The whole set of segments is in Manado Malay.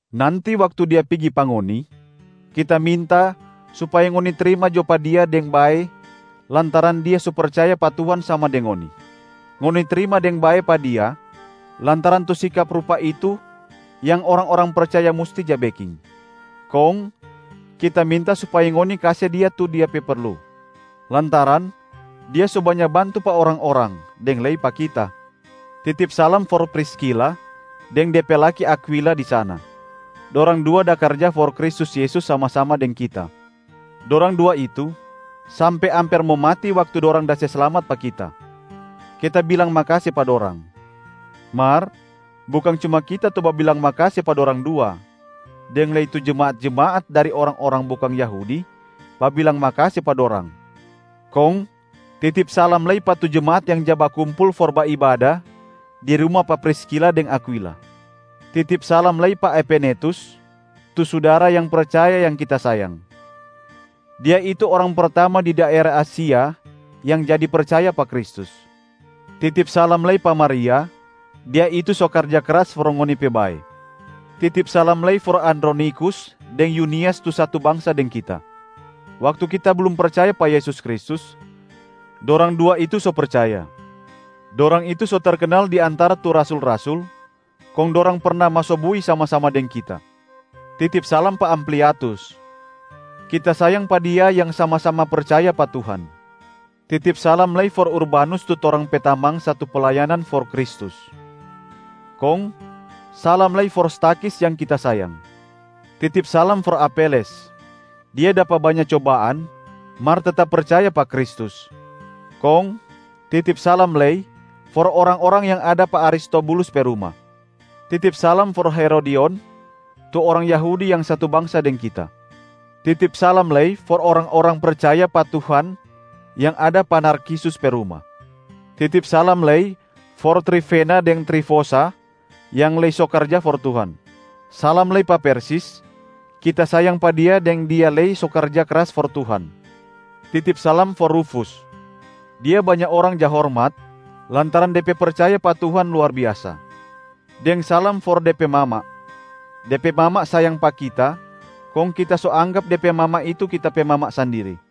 Nanti waktu dia pigi pa ngoni, kita minta supaya ngoni trima jo pa dia deng bae lantaran dia so percaya pa Tuhan sama deng ngoni. Ngoni trima deng bae pa dia lantaran tu sikap rupa itu yang orang-orang percaya musti ja beking. Kong kita minta supaya ngoni kase dia tu dia perlu, lantaran dia so banya bantu pa orang-orang deng lei pa kita. Titip salam for Priskila deng de pe laki Akwila di sana. Dorang dua da karja for Kristus Yesus sama-sama deng kita. Dorang dua itu sampe amper mo mati waktu dorang da se slamat pa kita. Kita bilang makase pa dorang. Mar bukang cuma kita tu babilang makase pa dorang dua, deng lei tu jemaat-jemaat dari orang-orang bukang Yahudi babilang makase pa dorang. Kong titip salam lei pa tu jemaat yang ja bakumpul for baibada di ruma pa Priskila deng Akwila. Titip salam lei pa Epenetus, tu sudara yang percaya yang kita sayang. Dia itu orang pertama di daera Asia yang jadi percaya pa Kristus. Titip salam lei pa Maria, dia itu so karja kras for ngoni pe bae. Titip salam lei for Andronikus deng Yunias tu satu bangsa deng kita. Waktu kita blum percaya pa Yesus Kristus, dorang dua itu so percaya. Dorang itu so terkenal di antara tu rasul-rasul, kong dorang perna maso bui sama-sama deng kita. Titip salam pa Ampliatus. Kita sayang pa dia yang sama-sama percaya pa Tuhan. Titip salam lei for Urbanus tu torang pe tamang satu playanan for Kristus. Kong salam lei for Stakhis yang kita sayang. Titip salam for Apeles. Dia dapa banya cobaan mar tetap percaya pa Kristus. Kong titip salam lei for orang-orang yang ada pa Aristobulus pe ruma. Titip salam for Herodion, tu orang Yahudi yang satu bangsa deng kita. Titip salam lei for orang-orang percaya pa Tuhan yang ada pa Narkisus pe ruma. Titip salam lei for Trifena deng Trifosa yang lei so karja for Tuhan. Salam lei pa Persis, kita sayang pa dia deng dia lei so karja kras for Tuhan. Titip salam for Rufus. Dia banya orang ja hormat lantaran de pe percaya pa Tuhan luar biasa. Deng salam for de pe mama. De pe mama sayang pa kita kong kita so anggap de pe mama itu kita pe mama sandiri.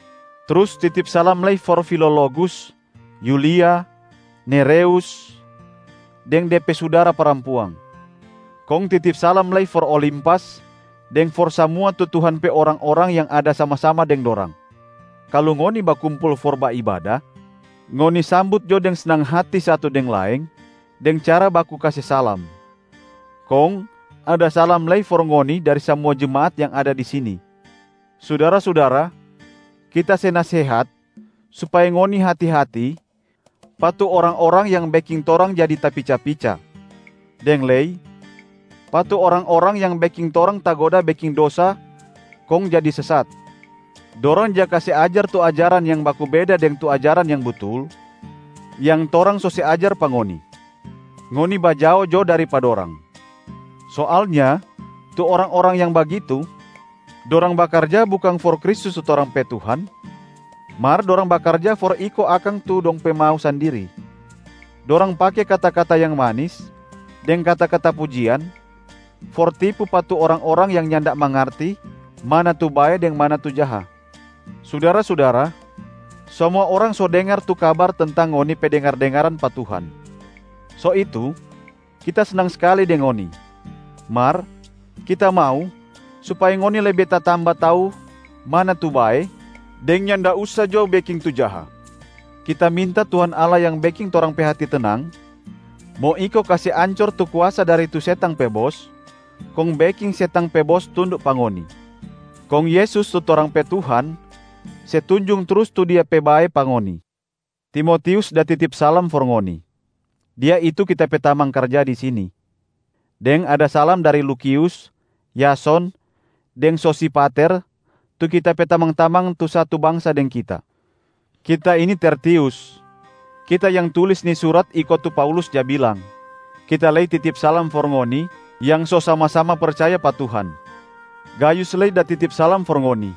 Trus titip salam lei for Filologus, Yulia, Nereus deng de pe sudara parampuang. Kong titip salam lei for Olimpas deng for samua tu Tuhan pe orang-orang yang ada sama-sama deng dorang. Kalu ngoni bakumpul for baibada, ngoni sambut jo deng snang hati satu deng laeng deng cara baku kase salama. Kong ada salam lei for ngoni dari samua jemaat yang ada di sini. Sudara-sudara, kita se nasehat supaya ngoni hati-hati pa tu orang-orang yang beking torang jadi tapica-pica, deng lei pa tu orang-orang yang beking torang tagoda beking dosa kong jadi sesat. Dorang ja kase ajar tu ajaran yang baku beda deng tu ajaran yang butul yang torang so se ajar pa ngoni. Ngoni bajao jo dari pa dorang. Soalnya tu orang-orang yang bagitu, dorang bakarja bukang for Kristus tu torang pe Tuhan, mar dorang bakarja for iko akang tu dong pe mau sandiri. Dorang pake kata-kata yang manis deng kata-kata pujian for tipu pa tu orang-orang yang nyanda mangarti mana tu bae deng mana tu jaha. Sudara-sudara, samua orang so dengar tu kabar tentang ngoni pe dengar-dengaran pa Tuhan. So itu, kita snang skali deng ngoni. Mar kita mau supaya ngoni lebe tatamba tau mana tu bae, deng nyanda usa jo beking tu jaha. Kita minta Tuhan Allah yang beking torang pe hati tenang, mo iko kase ancor tu kuasa dari tu setang pe bos kong beking setang pe bos tunduk pa ngoni. Kong Yesus tu torang pe Tuhan se tunjung trus tu Dia pe bae pa ngoni. Timotius da titip salam for ngoni. Dia itu kita pe tamang karja di sini. Deng ada salam dari Lukius, Yason deng Sosipater tu kita pe tamang-tamang tu satu bangsa deng kita. Kita ini Tertius, kita yang tulis ni surat iko tu Paulus ja bilang, kita lei titip salam for ngoni yang so sama-sama percaya pa Tuhan. Gayus lei da titip salam for ngoni.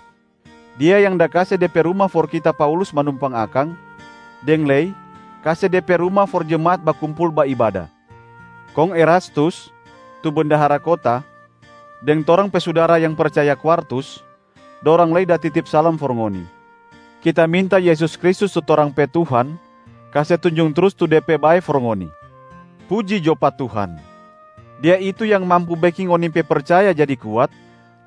Dia yang da kase de pe ruma for kita Paulus manumpang akang, deng lei kase de pe ruma for jemaat bakumpul baibada. Kong Erastus, tu bendahara kota, deng torang pe sudara yang percaya Kwartus, dorang lei da titip salam for ngoni. [ Kita minta Yesus Kristus tu torang pe Tuhan kase tunjung trus tu De pe bae for ngoni.] Puji jo pa Tuhan! Dia itu yang mampu beking ngoni pe percaya jadi kuat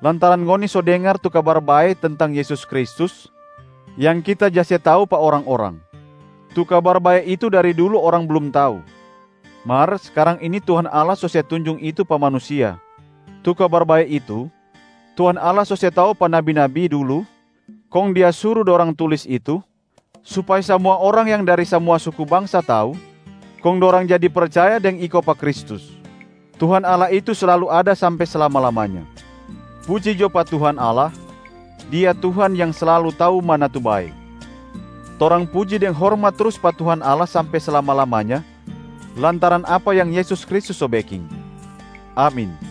lantaran ngoni so dengar tu Kabar Bae tentang Yesus Kristus yang kita ja se tau pa orang-orang. Tu Kabar Bae itu dari dulu orang blum tau, mar skarang ini Tuhan Allah so se tunjung itu pa manusia. Tu Kabar Bae itu, Tuhan Allah so se tau pa nabi-nabi dulu kong Dia suru dorang tulis itu supaya samua orang yang dari samua suku bangsa tau kong dorang jadi percaya deng iko pa Kristus. Tuhan Allah itu slalu ada sampe slama-lamanya. Puji jo pa Tuhan Allah, Dia Tuhan yang slalu tau mana tu bae. Torang puji deng hormat trus pa Tuhan Allah sampe slama-lamanya lantaran apa yang Yesus Kristus so beking. Amin.